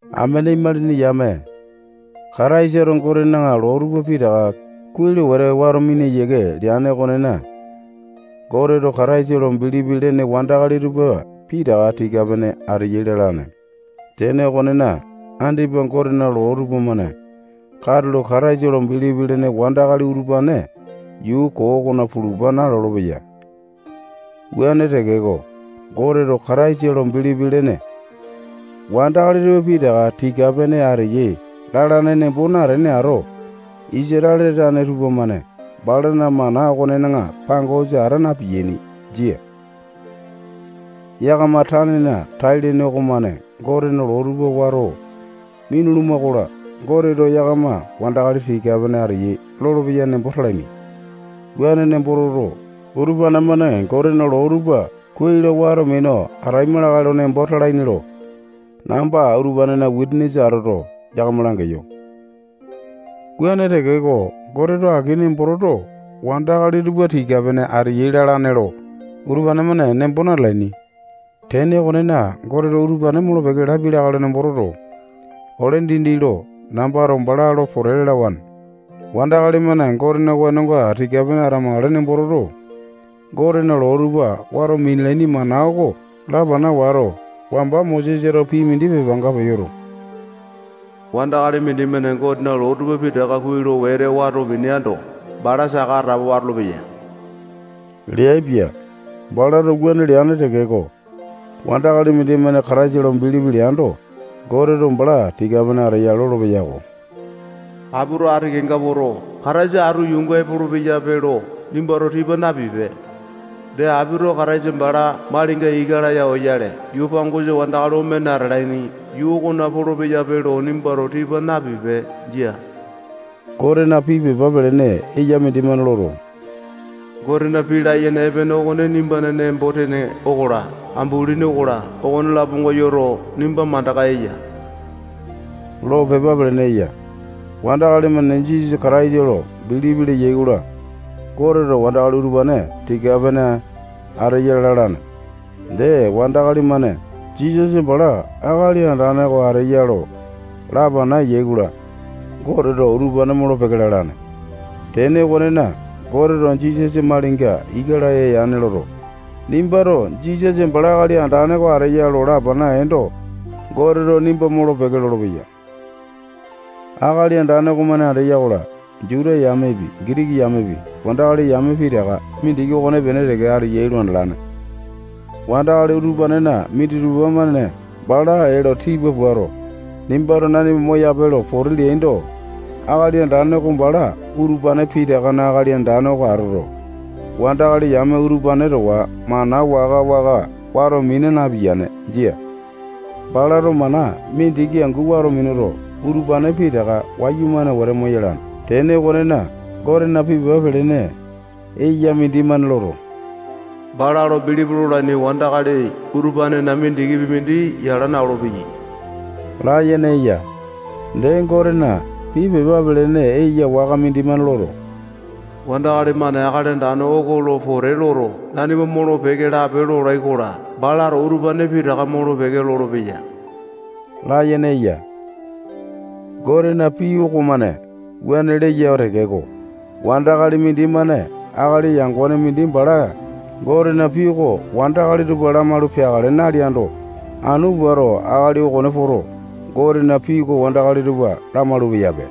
Amene imalini yame, Kataisato Gotena loo tupa pitaka kuai lo wete wato mina yiake leane okonena, Goteto Kataisa lo bilipi lene wandakali tupa pitaka tika-pene ateyai lalane. Tene okonena, andipa Gotena loo tupamane katulo Kataisa lo bilipi lene wandakali utupane yuu koo okona pulupa nalolo-peya. Wuane tekeko, Goteto Kataisa lo bilipi lene wandakali tupa pitaka tika-pene ateyai lalane nembo natene ato, Isatale tane tupamane balana mana okonena pangosa ata na-piyaini. Jia. Yakama tanena tai-lene okomane Gotena loo tupa wato minuluma-kola, Goteto yakama wandakali tika-pene ateyai lolopeya nembo talaini. Wuane nembo toto, utupane-mane Gotena loo tupa kuai lo wato minu ataima lakae lo nembo talaini lo namba utupanena wisanisa atoto, yakama langeyo. Wuane tekeko, Goteto aki nembo toto, wandakali tupa tika-pene ateyai lalane lo utupane-mane nembo natalaini. Tene okonena, Goteto utupane molo-peke lapia lakae lo nembo toto, ole dindi lo nambato bala lo pote lalawane. Wandakali-mane Gotena wenonga tika-pene atamakale nembo toto, Gotena loo tupa wato minalaini mana oko lapana wato, wamba Mosesato pii mindi pepanga peyoto, wandakali mindimane Gotena loo tupa pitaka kuai lo wete wato mineando, bala saka atapowa atolopeya leaipia. Balato wuane leane tekeko, wandakali mindimane Kataisa lo bilipi leando, Goteto bala tika-pene ateya lolopeya-ko. Apito ati kenga poto, Kataisa atu yuunga epolo-peyape lo nimbato tipa napipe. Dee, apito Kataisa bala malinga ika laya oyale, yuu pangosa wandakali omene atalaini yuu okona polo-peyape lo nimbato tipa napipe. Jia. Gotena pii pepa pelene eya mindimane loto, Gotena pii layene epene okone nimbana nembo-tene okola, ambulini okola, okone-laponga yoto, nimba mandaka eya lo pepa pelene eya. Wandakali-mane Jisasa Kataisa lo bilipi leyai-kola, Goteto wandakali utupane tika-pene ateyai lalane. Dee, wandakali-mane Jisasa bala Akali Andane oko ateya lo lapana eyai-kola, Goteto utupane molo-peke lalane. Tene okonena, Goteto Jisasa malinga ika laya yane loto, nimbato Jisasa bala Akali Andane oko ateya lo lapana eendo, Goteto nimba molo-peke lolopeya. Akali Andane okomane andeya-kola, Juta yamepi, Gitiki yamepi, wandakali yame pitaka mindiki okonepene teke ateyai lo andalane. Wandakali utupanena minditupa-mane bala ee lo tipa puato, nimbato nanima moyape lo pote leaindo, Akali Andane oko bala utupane pitakana Akali Andane oko atoto, wandakali yame utupane towa mana waka-waka wato mina napiyane. Jia. Balato mana mindiki angu wato minuto, utupane pitaka wayumane wete moyalane. Tene okona, Gotena pii pepa pelene eya mindimane loto, bala lo bilipi lolaini wandakali utupanena mindikipi mindi yala na-olopeyai layene eya. Dee, Gotena pii pepa pelene eya waka mindimane loto, wandakali-mane Akali Andane oko lo pote loto, nanima molo-peke lape lolai-kola, balato utupane pitaka molo-peke lolopeya layene eya. Gotena pii okomane wuane leya tekeko, wandakali mindimane akali yangone mindi bala Gotena pii oko wandakali tupa lamalu peakale naleando, anu puato akali okone poto, Gotena pii oko wandakali tupa lamalu-peyape.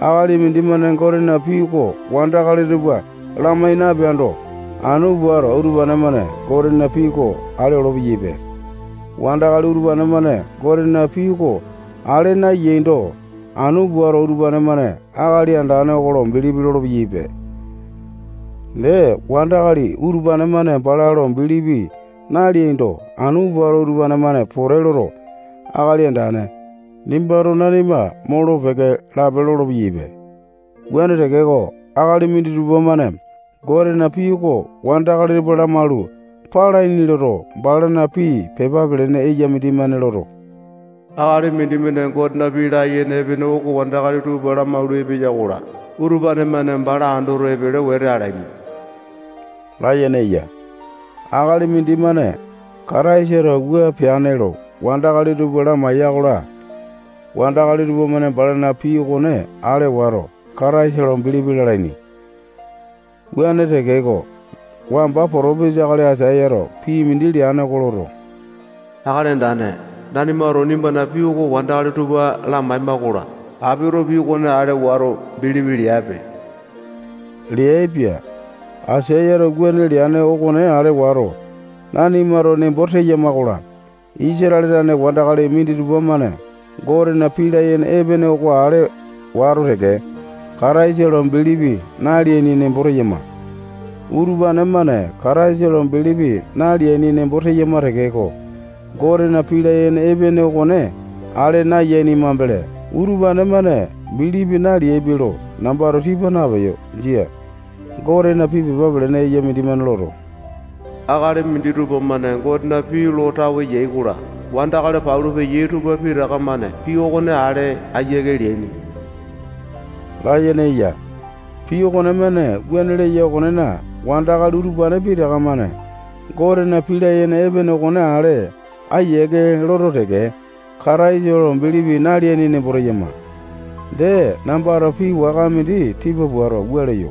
Akali mindimane Gotena pii oko wandakali tupa lamai napeando, anu puato utupane-mane Gotena pii oko ale olo-peyaipe. Wandakali utupane-mane Gotena pii oko ale nayaindo, anu puato utupane-mane Akali Andane oko lo bilipi lolo-peyaipe. Dee, wandakali utupane-mane bala lo bilipi naleaindo, anu puato utupane-mane pote loto, Akali Andane, nimbato nanima molo-peke lape lolo-peyaipe. Wuane tekeko, akali minditupa-mane Gotena pii oko wandakali tupa lamalu palaini loto, balana pii pepa pelene eya mindimane loto, akali mindimane Gotena pii layene epene oko wandakali tupa lamalu epeya-kola, utupane-mane bala andoto, epele wete alaini layene eya. Akali mindimane Kataisato wua peane lo wandakali tupa lamaiya-kola, wandakali tupamane balana pii okone ale wato, Kataisa lo bilipi lalaini. Wuane tekeko, wamba potopisa akali Aisayato pii mindi leane oko loto, Akali Andane, nanimato nimbana pii oko wandakali tupa lamaema-kola, apito pii okone ale wato, bilipi leape leaipia. Aisayato wuane leane okone ale wato, nanimato nembo teyama-kola, Isatale tane wandakali minditupa-mane Gotena pii layene epene okone ale wato teke, Kataisa lo bilipi naleaini nembo teyama. Utupane-mane Kataisa lo bilipi naleaini nembo teyama tekeko, Gotena pii layene epene okone ale nayaini mambele, utupane-mane bilipi naleaipe lo nambato tipa napeyo. Jia. Gotena pii pepa pelene eya mindimane loto, akali minditupa-mane Gotena pii lo tawe yai-kola, wandakali palu peyai tupa pitaka-mane pii okone ale ayiake leaini layene eya. Pii okonemane wuane leya okonena, wandakali utupane pitaka-mane Gotena pii layene epene okone ale ayiake loto teke, Kataisa lo bilipi naleaini nembo teyama. Dee, nambato pii waka mindi tipa puato, wua leyo: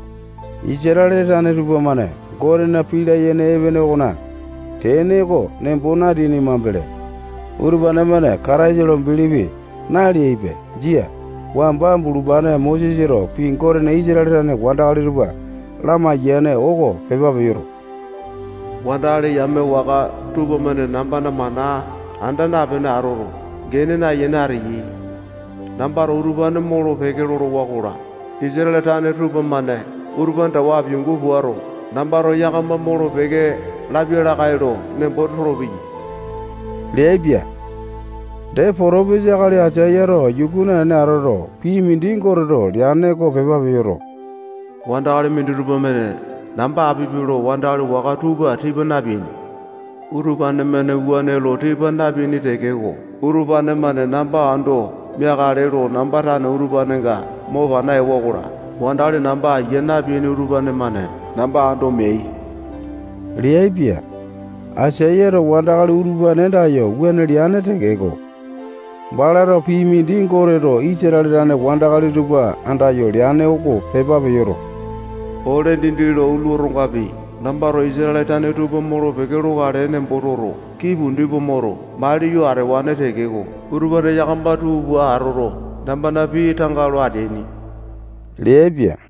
Isatale tane tupamane Gotena pii layene epene okona tene oko nembo nateaini mambele, utupane-mane Kataisa lo bilipi naleaipe. Jia. Wamba bulupane Mosesato pii Goteto Isatale tane wandakali tupa lamaiyane oko pepa peyoto, wandakali yame waka tupamane nambana mana anda napene atoto, gene nayene ateyai. Nambato utupane molo-peke lolowa-kola, Isatale tane tupamane utupane towa apiangu puato, nambato yakama molo-peke lapia lakae lo nembo tolopeyai leaipia. Dee, potopisa akali Aisayato yuku naene atoto, pii mindi Goteto leane oko pepa peyoto, wandakali minditupa-mane namba apipe lo wandakali waka tupa tipa napeaini. Utupane-mane wuane lo tipa napeaini tekeko, utupane-mane namba ando meakale lo namba tane utupanenga mo pana ewa-kola, wandakali namba aiya napeaini utupane-mane namba ando meai leaipia. Aisayato wandakali utupane andayo wuane leane tekeko, balato pii mindi Goteto Isatale tane wandakali tupa andayo leane oko pepa peyoto, ole dindi lo utulu otongapi, nambato Isatale tane tupa molo-peke lokale nembo toto, kii pundi pua moto, maliyo atewane tekeko, utupane yakama tuu pua atoto, nambana pii tanga lo ateaini leaipia.